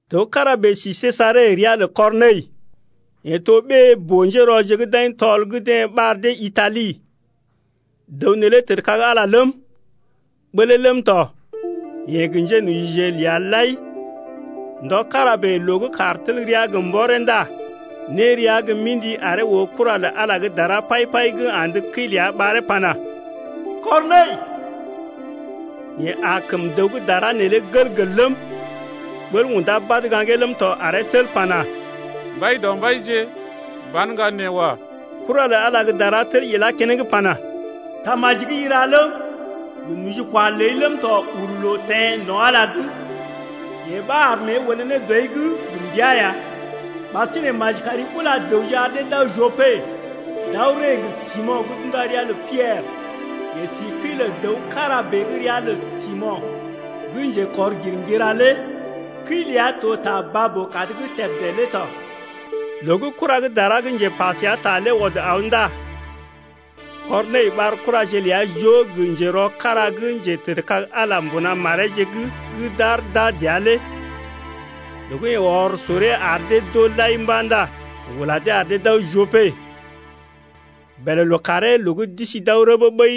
Dəw kára bèe si Sejare ria lə Kɔrnəi, yeḛ to ɓée boo-njérɔje gə́ d’aḭ tɔl gə́ deḛ ɓar dee Itali. Dəw neelé tədkag Ala ləm, ɓəlee ləm tɔ, yeḛ gə njénojije ləa lai ya. Ndɔ kára bèe loo gə́ kàr tel rəa gə mbɔree ndá né rəa gə́ mḭdi aree oo kura lə Ala gə́ dara pai-pai gə́ andə kəi ləa ɓaree pana: Kɔrnəi! Yeḛ aa kəm dəw gə́ dara neelé gəl-gəl ləm, ɓəl undá badə gaŋgee ləm tɔ aree tel pana: Mbaidɔmbaije ban ŋga nee wa. Kura lə Ala gə́ dara tel ilá keneŋ pana: Tamaji gə́ i ra ləm, gə nojikwa ləi ləm tɔ uru loo teḛ no̰ Ala’g, yee ɓa ar mée olé ne dɔi’g gə mbəa ya. Ɓasinè maji kari ula dəwje ar dee d’aw Jope d’aw ree gə Simo̰ gə́ d’unda ria lə Piɛrə. Yeḛ si kəi lə dəw kára bèe gə́ ria lə Simo̰ gə́ njekɔr-girŋgira lé, kəi ləa to ta baa-boo-kad’g tebdé lé tɔ. Loo gə́ kura gə́ dara gə́ njepa səa ta lé ɔd aw ndá Kɔrnəi ɓar kuraje ləa joo gə njerɔ kára gə́ njetədkag Ala lé mbuna mareeje’g gə́ d’aar d’aa dəa lé. Loo gə́ yeḛ ɔr soree ar dee d’oo lai mba̰ ndá yeḛ ula dee ar dee d’aw Jope. Bèlè lookàree loo gə́ d’isi d’aw rəbee ɓəi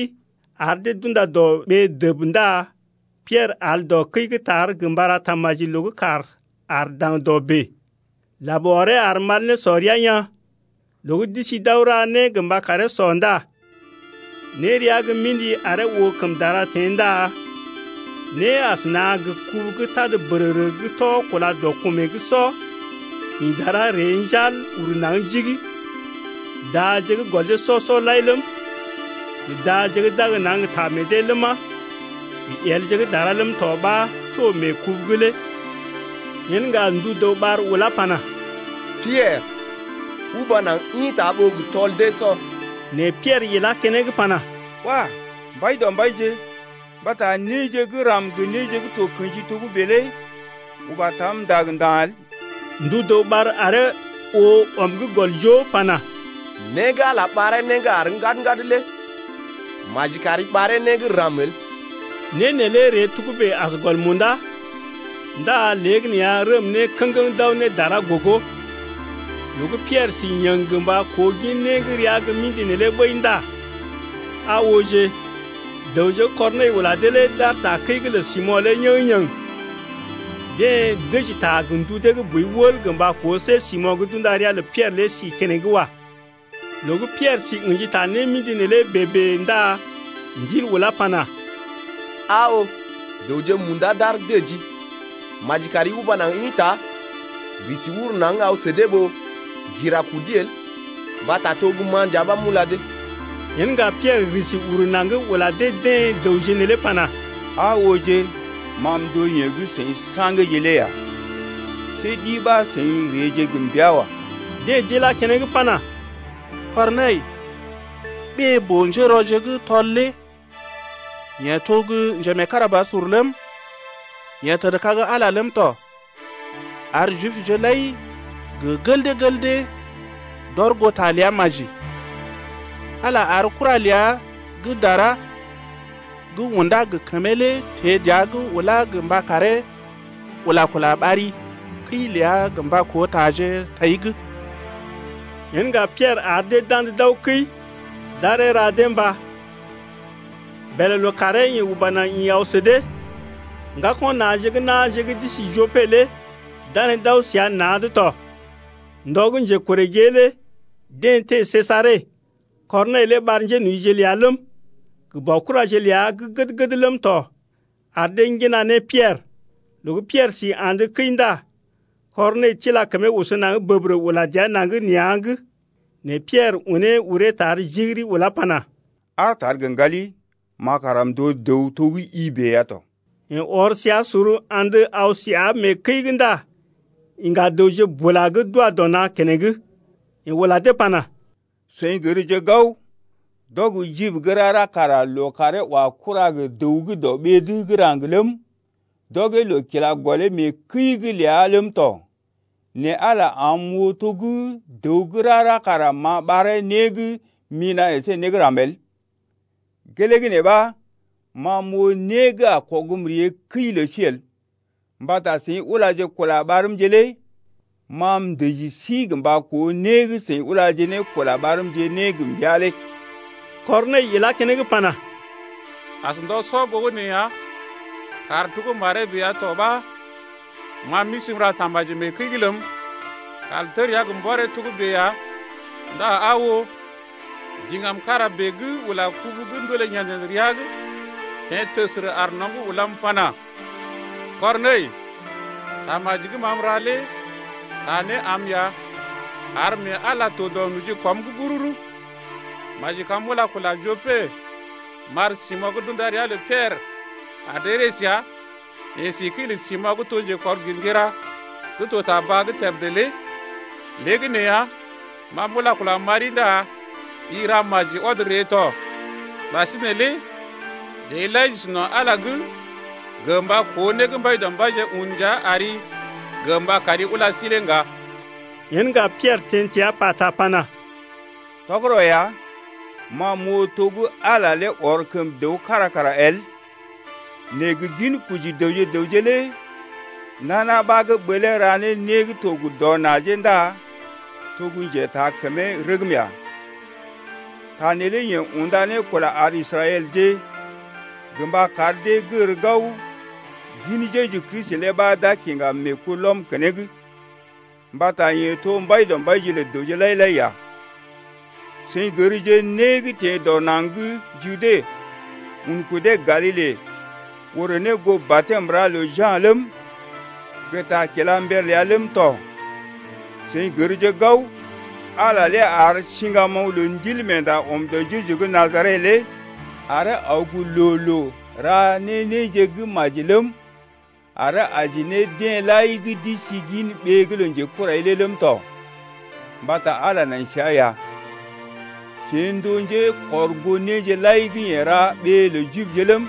ar dee d’unda dɔ ɓee dəb ndá Piɛrə al dɔ kəi gə́ tar gə mba ra tamaji loo gə́ kàr aar daŋdɔ bèe. Lab ɔree ar mal nésɔ rəa yaa̰. Loo gə́ d’isi d’aw ra né gə mba karee sɔ ndá né rəa gə́ mḭdi aree oo kəm dara teḛ ndá né asəna gə kubu gə́ tad bərərə gə́ tɔ kúla dɔ kumee’g sɔ, ḭ dara ree njal ur naŋg jig. Daje gə́ gɔl dee sɔ-sɔ lai ləm, gə daje gə́ d’ag naŋg gə ta meḛ dee ləma, gə yelje gə́ dara ləm tɔ ɓa to mee kubu’g lé. Yen ŋga ndu dəw ɓar ulá pana: Piɛrə, uba naŋg ḭta ɓó gə tɔl dee sɔ. Nɛ Piɛrə ilá keneŋ pana: Wah! Mbaidɔmbaije, mbata néje gə́ ram gə néje gə́ to kḛji togə́bè lé uba tam ndag nda̰ el. Ndu dəw ɓar aree oo ɔm gə́ gɔl joo pana: Né gə́ Ala ɓaree né gə́ àr ŋgad-ŋgad lé maji kari ɓaree né gə́ ram el. Né neelé ree togə́bè as gɔl munda, ndá léegəneeya rəm ne kə̰geŋ d’aw ne dara gogo. Loo gə́ Piɛrə si yəŋ gə mba koo gin né gə́ rəa gə́ mḭdi neelé ɓəi ndá aa ooje, dəwje gə́ Kɔrnəi ula dee lé d’aar takəi’g lə Simo̰ lé yéŋgé-yéŋgé. Deḛ dəji ta gə ndu dee gə́ boi wəl gə mba koo see Simo̰ gə́ d’unda ria lə Piɛrə lé si keneŋ wa. Loo gə́ Piɛrə si ə̰ji ta némḭdi neelé bèe-bèe ndá Ndil ulá pana: Aa oo, dəwje munda d’aar dəjii. Maji kari uba naŋg ḭta risi uru naŋg, aw sə dee ɓó ŋgira kudi el mbata to gə́ ma nja ɓa m’ula dee. Yen ŋga Piɛrə risi uru naŋg ula dee-deḛ dəwje neelé pana: Aa ooje, ma m’to yeḛ gə́ seḭ sa̰geeje lé ya. See ɗi ɓa seḭ reeje gə mbəa wa. Deḛ d’ilá keneŋ pana: Kɔrnəi, ɓée boo-njérɔje gə́ tɔl lé yeḛ to gə́ njemeekarabasur ləm, yeḛ tədkag Ala lé ləm tɔ, ar Jibje lai gə gel dee gel dee d’ɔr goo ta ləa maji. Ala ar kura ləa gə́ dara gə́ undá gə kəmee lé teḛ dəa’g ulá gə mba karee ula-kula ɓari kəi ləa gə mba koo taje tai’g. Yen ŋga Piɛrə ar dee d’andə d’aw kəi, d’aree ra dee mbá. Bèlè lookàree yeḛ uba naŋg ḭ aw sə dee. Ŋgako̰ na̰je gə́ na̰je gə́ d’isi Jope lé danee d’aw səa na̰’d tɔ. Ndɔ gə́ njekorè gée lé deḛ teḛ Sejare. Kɔrnəi lé ɓar njénojije ləa ləm, gə baokuraje ləa gə́ gəd-gəd ləm tɔ ar dee ŋgina ne Piɛrə. Loo gə́ Piɛrə si andə kəi ndá Kɔrnəi tila kəmee oso naŋg bəbərə ula dəa naŋg nea̰’g. Nɛ Piɛrə unee uree tar jigiri ulá pana: Aar tar gə ŋgali, ma kara m’to dəw to gə́ i bèe ya tɔ. Yeḛ ɔr səa sor andə aw səa mee kəi’g ndá iŋga dəwje bula gə́ d’wa dɔ na̰ keneŋ. Yeḛ ula dee pana: Seḭ gərje gao, d’ɔg Jib gə́ rara kara loo karee wa kura gə dəw gə́ dɔ ɓee’d gə́ raŋg ləm, d’ɔgee loo kila gɔlee mee kəi’g ləa ləm tɔ. Nɛ Ala am m’oo to gə́ dəw gə́ rara kara m’a ɓaree né gə́ mina̰ əsé né ram el. Gelee gə́ nee ɓa ma m’oo né gə́ a kɔgm ree kəi lə sí el mbata seḭ ulaje kula ɓarmje lé. Ma m’dəji sí gə mba koo né gə́ seḭ ulaje ne kula ɓarmje ne gə mbəa lé. Kɔrnəi ilá keneŋ pana: As ndɔ sɔ ɓogənè ya kàr to gə́ maree bèe ya tɔ ɓa ma m’isi m’ra tamaji mee kəi’g ləm, kàr tel rəa gə mbɔree togə́bè ya, ndá aa oo, diŋgam kára bèe gə́ ula kubu gə́ ndoolé yḛd-yḛd rəa’g teḛ təsərə aar nɔm’g ulam pana: Kɔrnəi, tamaji gə́ ma m’ra lé taa né am ya ar mee Ala to dɔ nojikwam’g bururu. Maji kam m’ula kula Jope m’ɓar Simo̰ gə́ d’unda ria lə Piɛrə ar dee ree səa, yeḛ si kəi lə Simo̰ gə́ to njekɔr-girŋgira gə́ to ta baa’g tebdé lé. Léegəneeya ma m’ula-kula m’ɓari ndá i ra maji ɔd ree tɔ. Ɓasinè lé jeḛ lai j’isi no̰ Ala’g gə mba koo né gə́ Mbaidɔmbaije un ndia ari gə mba kari ula sí lé ŋga. Yen ŋga Piɛrə teḛ təa pata pana: Tɔgərɔ ya, ma m’oo to gə́ Ala lé ɔr kəm dəw kára kara el. Nɛ gə ginkoji dəwje gə raŋg lé nana ɓa gə́ ɓəlee ra ne né gə́ to gə dɔ najee ndá to gə́ njetaakəmee rəgm ya. Ta neelé yeḛ unda ne kula ar Israɛlje gə mba kar dee gər gao gin Jeju Kristi lé ɓa d’a kiŋga meekulɔm keneŋ mbata yeḛ to Mbaidɔmbaije lə dəwje lai-lai ya. Seḭ gərje né gə́ teḛ dɔ naŋg gə́ Jude un kudee Galile orè ne goo batɛm ra lə Ja̰ ləm, gə ta kila mber ləa ləm tɔ. Seḭ gərje gao, Ala lé ar siŋgamoŋ lə Ndilmeenda ɔm dɔ Jeju gə́ Najaret’g lé aree aw gə loo-loo ra ne néje gə́ maji ləm, aree aji ne deḛ lai gə́ d’isi gin ɓee’g lə njekurai’g lé ləm tɔ mbata Ala lé nai səa ya. Jeḛ n’to gə́ njekɔrgoo néje lai gə́ yeḛ ra ɓee lə Jibje ləm,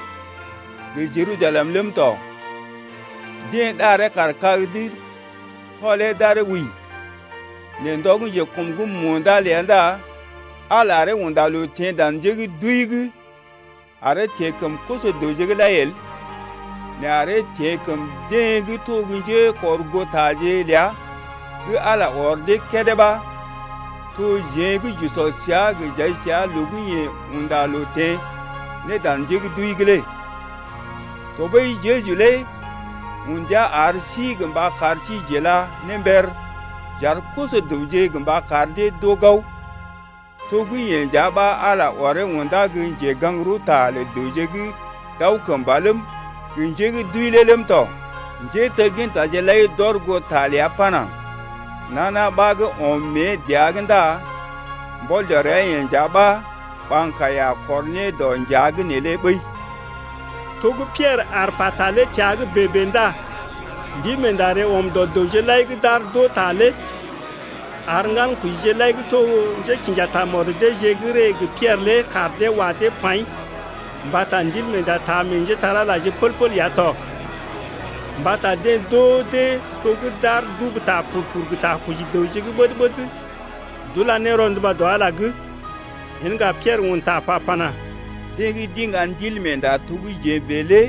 gə Jerusalem ləm tɔ. Deḛ ɗaree kaar kag’d tɔlee d’aree wəi. Nɛ ndɔ gə́ njekɔm’g munda ləa ndá Ala aree unda loo teḛ dan njé gə́ d’wəi’g aree teḛ kəm koso-dəwje’g lai el, nɛ aree teḛ kəm deḛ gə́ to gə́ njékɔrgootaje ləa gə́ Ala ɔr dee kédé ɓa, to jeḛ gə́ j’usɔ səa gə j’ai səa loo gə́ yeḛ unda loo teḛ ne dan njé gə́ d’wəi’g lé. Tɔɓəi Jeju lé un ndia ar sí gə mba kar sí j’ila ne mber j’ar koso-dəwje gə mba kar dee d’oo gao, to gə́ yeḛ nja ɓa Ala ɔree undá gə́ njegaŋ-rəwta lə dəwje gə́ d’aw kəmba ləm, gə njé gə́ d’wəi lé ləm tɔ. Njéteggintaje lai d’ɔr goo ta ləa pana: Nana ɓa gə́ ɔm mée dəa’g ndá mbɔl dɔ ria-yeḛ nja ɓa ɓaŋg kaiya a kɔr ne dɔ njea’g neelé ɓəi. To gə́ Piɛrə aar pata lé təa’g bèe-bèe ndá Ndilmeenda ree ɔm dɔ dəwje lai gə́ d’aar d’oo ta lé. Ar ŋgankojije lai gə́ to njékḭja tamɔd deeje gə́ ree gə Piɛrə lé kaar dee wa dee paḭ mbata Ndilmeenda taa meḛ njépole-magəje pəl-pəl ya tɔ. Mbata deḛ d’oo dee to gə́ d’aar d’ubu ta pur-pur gə ta koji dəwje gə́ ɓəd-ɓəd d’ula ne rɔnduba dɔ Ala’g lé. Yen ŋga Piɛrə un ta pa pana: Deḛ gə́ d’iŋga Ndilmeenda to gə́ jeḛ bèe lé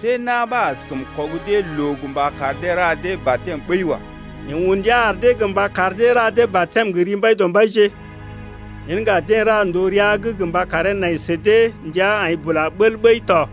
see na̰ ɓa askəm kɔg dee loo gə mba kar dee ra dee batɛm ɓəi wa. Yeḛ un ndia ar dee gə mba kar dee ra dee batɛm gə ri Mbaidɔmbaije. Yen ŋga deḛ ra ndòo rəa’g gə mba karee nai sə dee ndəa aḭ bula bəl ɓəi tɔ.